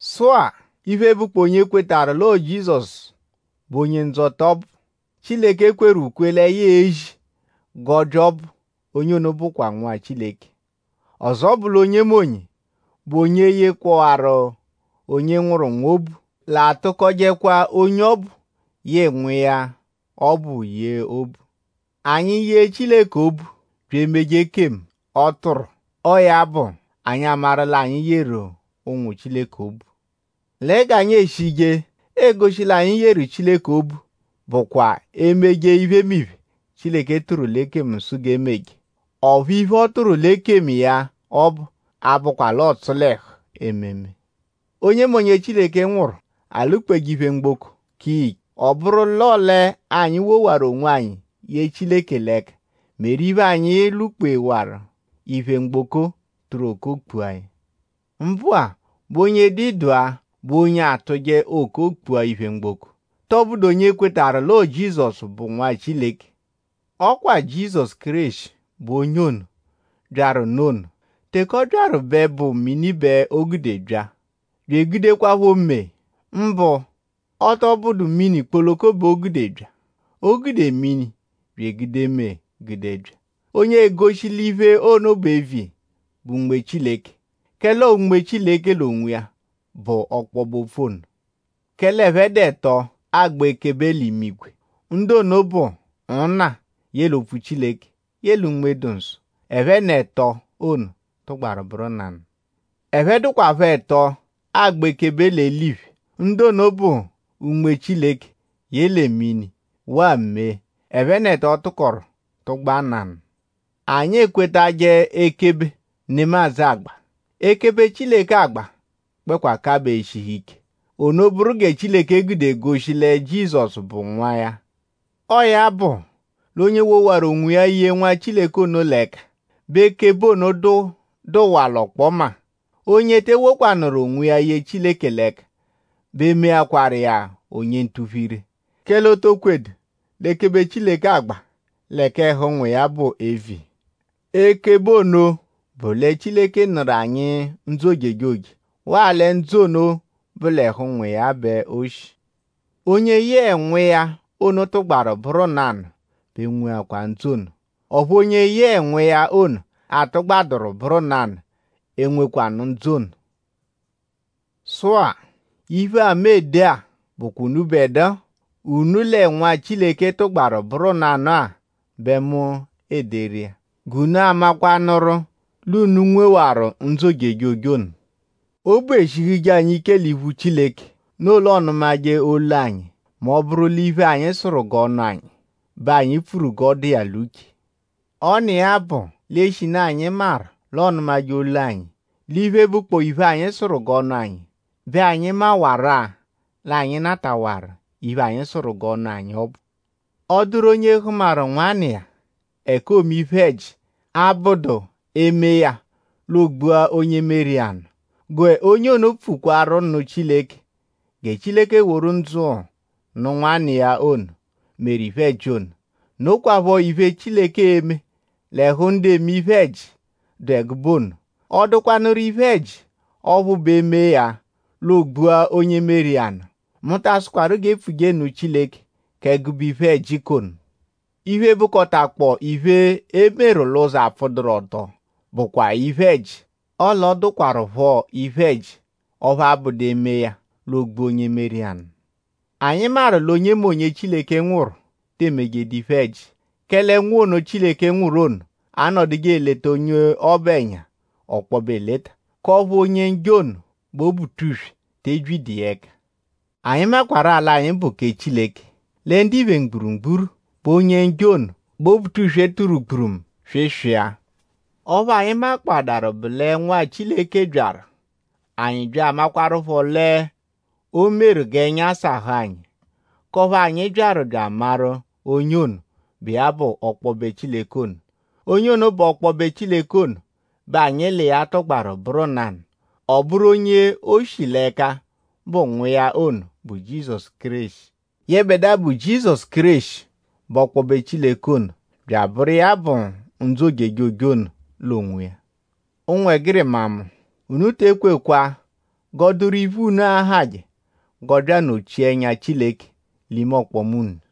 Sụ-a; iphe, bụkpoo onye kwetarụ l'ọo Jizọsu bụ Onye-Ndzọta ọbu, Chileke kweru ukwe lẹ ya e-zi g'ọ bya ọbu; onye ono bụakwaa nwa Chileke. Ọzo bụ l'onyemonye, bụ onye yekpọwaru onye nwụru nwa obu l'atụkojekwa onye ọbu yẹe nwa iya ọbu yee obu. Anyi -yee Chileke obu bya emeje ekemu, ọ tụru; ọo ya bụ anyi amaru l'anyi yeru ụnwu Chileke obu. Lẹ g'anyi e-shije goshi l'anyi yeru Chileke obu bụkwa emeje iphemiphe, Chileke tụru l'ekemu sụ g'e meje. Ọphu iphe, ọ tụru l'ekemu iya ọbu abụkwa l'ọotsu l'ẹhu ememe. Onyemonye, Chileke nwụru; alwụ-kpeje iphe mgboko; ka iya ike. Ọ bụru l'ọo l'anyi wowaru onwanyi ye Chileke l'ẹka meru iphe, anyi lwụ-kpewaru iphe mgboko; tụru okoo kpua ya. Mbụ-a;?bụ onye dụ ịdagha bụ onye atụje okoo kpua iphe mgboko??Tọbudu onye kwetarụ l'ọo Jizọsu bụ Nwa Chileke? Ọ kwa Jizọsu Kéreshi bụ onye ono, byaru nụ ono. Teke ọ byaru bẹ bụ mini bẹ o gude bya; bya egudekwaphọ mee. Mbụ-a; ọ tọ bụdu mini kpoloko bẹ o gude bya; o gude mini bya egude mee gude bya. Onye egoshi l'iphe ono bụ eviya bụ Unme Chileke; kẹle ọo Unme Chileke l'onwiya bụ ọkpobe-opfu ono. Kẹle ẹphe dụ ẹto agba ekebe l'imigwe. Ndu ono bụ Nna; yẹle Opfu-Chileke; yẹle Unme-dụ-Nsọ. Ẹphe n'ẹto ono tụgbaru bụru nanụ. Ẹphe dụkwapho ẹto agba ekebe l'eliphe. Ndu ono bụ Unme Chileke yẹle mini waa mee. Ẹphe n'ẹto tụkoru tụgba nanụ. Anyi ekwetajẹ ekebe, nemadzụ agba. Ekebe, Chileke agba gbẹkwa kabaa eshihu ike. Ono bụru gẹ Chileke gude egoshi lẹ Jizọsu bụ Nwa iya. Ọo ya bụ l'onye wowarụ onwiya ye Nwa Chileke ono l'ẹka bẹ ekebe ono dụwaa l'ọkpoma. Onye te ewokwanụru onwiya ye Chileke l'ẹka bẹ meakwaru iya onye ntuphu-ire; kẹle o to kwedu l'ekebe Chileke agba lẹ k'ẹhu Nwa iya bụ eviya. Ekebe ono bụ lẹ Chileke nụru anyi ndzụ ojejoje; waa lẹ ndzụ ono bụ l'ẹhu Nwa iya bẹ o shi. Onye yẹe Nwa iya ono tụgbaru bụru nanụ bẹ nweakwa ndzụ ono; ọphu onye yẹe Nwa iya ono atụgbaduru bụru nanụ enwekwanụ ndzụ ono. Sụ-a; iphe-a, mu ede-a bụkwa unubẹdua, unu lẹ Nwa Chileke tụgbaberu bụru nanụ-a bẹ mu ederu iya; g'unu amakwanụru l'unu nwewaru ndzụ ojejoje ono. Obu eshihuje anyi ike l'iphu Chileke; noo l'ọonumaje olu anyi mẹ ọ -bụru l'iphe, anyi sụru g'ọ nụ anyi bẹ anyi pfuru g'ọ dụ iya l'uche. Ọ n'iya bụ l'eshinu anyi maru l'ọonumaje olu anyi l'iphe, bụkpoo iphe, anyi sụru g'ọ nụ anyi; bẹ anyi maanarụ-a l'anyi natawaru iphe, anyi sụru g'ọ nụ anyi ọbu. Ọ -dụru onye hụmaru nwanna iya ẹka oome iphe-ẹji, abụdu e -mee ya; l'o gbua onye meru iya nụ; g'onye ono pfukwaru nụ Chileke gẹ Chileke woru ndzụ nụ nwanna iya ono, meru iphe-ẹji ono. Nokwaphọ iphe, Chileke e-me l'ẹhu ndu eme iphe-ẹji, dụ ẹgube ono. Ọ dụkwanuru iphe-ẹji ọphu bụ e -mee ya; l'oogbua onye meru iya nụ. Mu ta asụkwaru g'e pfuje nụ Chileke k'ẹgube iphe-ẹji k'ono. Iphe, bụkotakpoo iphe, e meru l'ụzo, apfụduru-ọto bụakwaa iphe-ẹji; ọle ọ dụkwarupho iphe-ẹji ọphu abụdu e -mee ya; l'oogbua onye meru iya nụ. Anyi maru l'onyemonye, Chileke nwụru te emejedu iphe-ẹji. Kẹle Nwa ono Chileke nwụru ono anọduje eleta onye ọbu ẹnya ọkpobe eleta; k'ọphu Onye-Njọ ono, bụ Obutuswe tee byidu iya ẹka. Anyi maakwaru l'anyi bụ kẹ Chileke; lẹ ndiphe mgburugburu bẹ Onye-Njọ ono, bụ Obutuswe tụru gburumu swịswia. Ọphu anyi makpọadaru bụ lẹ Nwa Chileke byaru; anyi bya amakwarụpho l'o meru g'ẹnya sahụ anyi; k'ọphu anyi byaru bya amaru onye ono, bụ iya bụ ọkpobe Chileke ono. Onye ono bụ ọkpobe Chileke ono bẹ anyi l'iya tụgbaru bụru nanụ. Ọ bụru onye o shi l'ẹka bụ Nwa iya ono, bụ Jizọsu Kéreshi. Yẹbedua, bụ Jizọsu Kéreshi bụ ọkpobe Chileke ono; bya abụru iya bụ ndzụ ojejoje ono l'onwiya. Ụnwegirima mu; unu te ekwejekwa g'ọ dụru iphe, unu ahajẹ g'ọ bya anọ-chia ẹnya Chileke l'ime ọkpoma unu.